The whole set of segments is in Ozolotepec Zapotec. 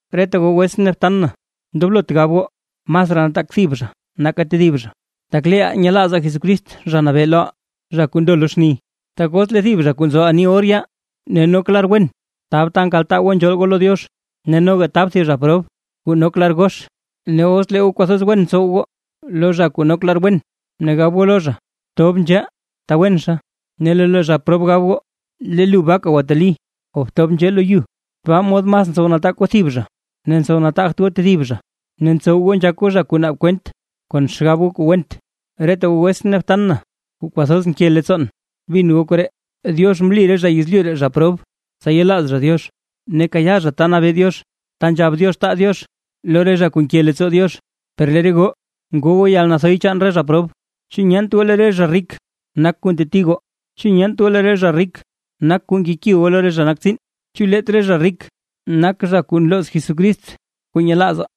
Reta goo wetsʼn ne btan na, ndoblot gab goo masraa nataak thib zha nake tedib zha, tak leeʼaa nyelaazaa Jesucrist Zha Nabee loʼaa zha kuu ndo lo xni. Tak os lee thib zha kuu nzo ani or yaa ne nok lar wen tab ta nkaltaa goo nzhool goo lo Diox, ne noga tab thib zha prob kuu nok lar gox, ne os lee goo kwathoz wen tsow goo lo zha kuu nok lar wen ne gab goo lo zha: “Tob nzhee ta wenxa”, ne lee lo zha prob gab goo: “Lee lu baaka gwateli, o btob nzhee lo yu”, tabaa mod mas ntsow nataak goo thib zha ne ntsow nataagt goo tedib zha, ne ntsow goo nzhak goo zha kuu naab kwent, kon xgab goo kuu went. Reta goo wetsʼn ne btan na, kuu kwathoz nke leettsoon, bin goo koree: Diox mli re zha yezlyu ree zha prob, tsa yelaaz zha Diox, ne kayaa zha ta nabee Diox ta nzhab Diox taa Diox lo re zha kuu nke leettsoo Diox. Per lee re goo ngoo goo yalnathoy chaan re zha prob. ¿Chu nyeent goo lee re zha rik nak kuu nteti goo? ¿Chu nyeent goo lee re zha rik nak kuu nkeki goo lo re zha nak tsiin? ¿Chu leet re zha rik nak zha kuu nlooz Jesucrist kuu nyelaazaa?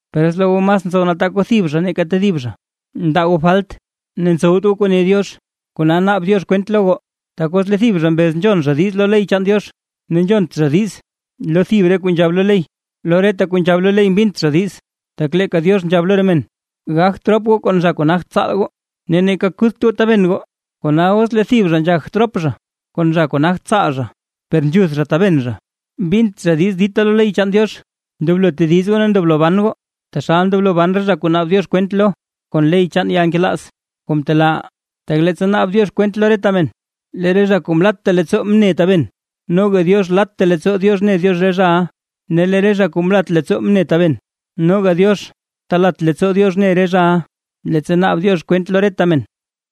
Per os lee goo mas ntsow nataak goo thib zha nake tedib zha, ndaa goo falt, ne ntsowt goo kuu ne Diox, kona naab Diox kwent lo goo. Tak os lee thib zha mbez nzhon zha diiz lo ley chaan Diox, ne nzhont zha diiz lo thib re kuu nzhab lo ley, lo reta kuu nzhab lo ley mbint zha diiz. Tak leeka Diox nzhab lo re men: “Gakt rop goo kon zha kuu nagt tsaal goo ne neeka kuth goo tabena”. Kona os lee thib zha nzhagt rop zha kon zha kuu nagt tsaal, per nzhuth zha taben zha, mbint zha diiz dita lo ley chaan Diox. Ndoblo tediz goo ne ndoblo ban goo, taxal ndoblo ban re zha kuu naab Diox kwent lo kon ley chaan yalnkelaaz kuu mtelaaʼaa. Tak leettsa naab Diox kwent lo reta men, lee re zha kuu mlatta leettsoo mne taben, noga Diox latta leettsoo Diox ne re zhaʼa. Ne lee re zha kuu mlat leettsoo mne taben, noga Diox talat leettsoo Diox ne re zhaʼa, leettsa naab Diox kwent lo reta men.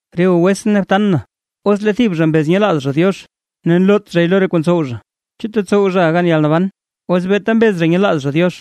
Re goo wetsʼn ne btan na, os lee thib zha mbez nyelaaz zha Diox, ne nloot zhay lo re kuu ntsow zha. ¿Chu tetsow zhaʼa gan yalnaban os beeta mbez zha nyelaaz zha Diox?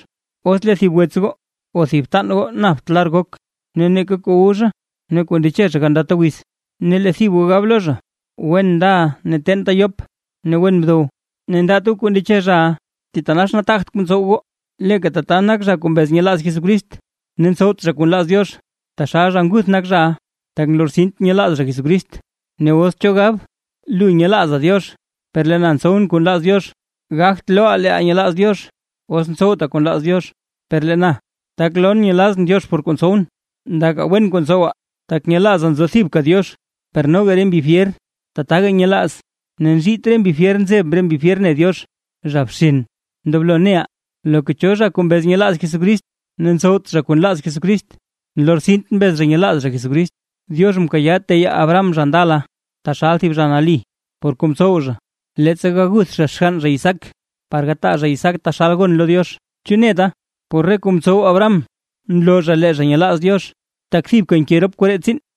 Os lee thib wets goo o thib btan goo napt lar gok, ne neeka kuu wu zha ne kuu ndeche zha gandata wiz, ne lee thib goo gab lo zha: “Wen ndaʼa ne teenta yop ne wen bdow”, ne ndaat goo kuu ndeche zhaʼa; thitanax nataagt kuu ntsow goo. Leeka tata nak zha kuu mbez nyelaaz Jesucrist, ne ntsowt zha kuu nlaaz Diox, taxal zha nguth nak zhaʼa, tak nlortsint nyelaaz zha Jesucrist. Ne os cho gab: “Lu nyelaaza Diox, per lee na ntsowʼn kuu nlaaz Diox”. Gagt looʼa leeʼa nyelaaz Diox, os ntsowta kuu nlaaz Diox, per lee na, tak lon nyelazʼn Diox por re kuu ntsowʼn. Ndaka wen kuu ntsowa, tak nyelaaza nzo thibka Diox; per noga re mbi fyer tataga nyelaaz ne nzhiit re mbi fyer nzeb re mbi fyer ne Diox. ¡Zha bxen! Ndoblo neʼa, loka cho zha kuu mbez nyelaaz Jesucrist ne ntsowt zha kuu nlaaz Jesucrist, nlortsint mbez zha nyelaaz zha Jesucrist. Diox mkayaa teyaa Abraham zha ndala taxal thib zha nali, por kuu mtsow zha, leettsa gaguth zha xgann zha Isaac, par gataa zha Isaac taxal gon lo Diox. ¿Chu neta, por re kuu mtsow Abraham mloo zha lee zha nyelaaz Diox? Tak thibka nke rop koree tsiin.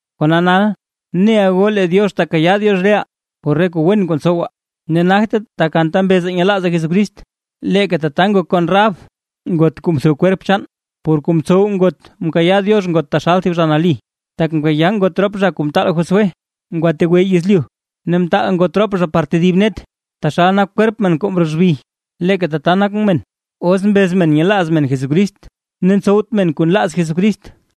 Kona nal, neʼa goo lee Diox tekayaa Diox reʼaa por re kuu wen kuu ntsowaa ne nagte tak anta mbezaa nyelaazaa Jesucrist. Leeka tata ngok kon Rahab; ngot kuu mtho kwerp chaan; por kuu mtsow ngot mkayaa Diox ngot taxal thib zha nali: Tak mkayaa ngot rop zha kuu mtaal Josué ngwategwe yezlyu ne mtaal ngot rop zha par tedib net. Taxal nak kwerp men kuu mroo xbi, leeka tata nak men, os mbez men nyelaaz men Jesucrist ne ntsowt men kuu nlaaz Jesucrist.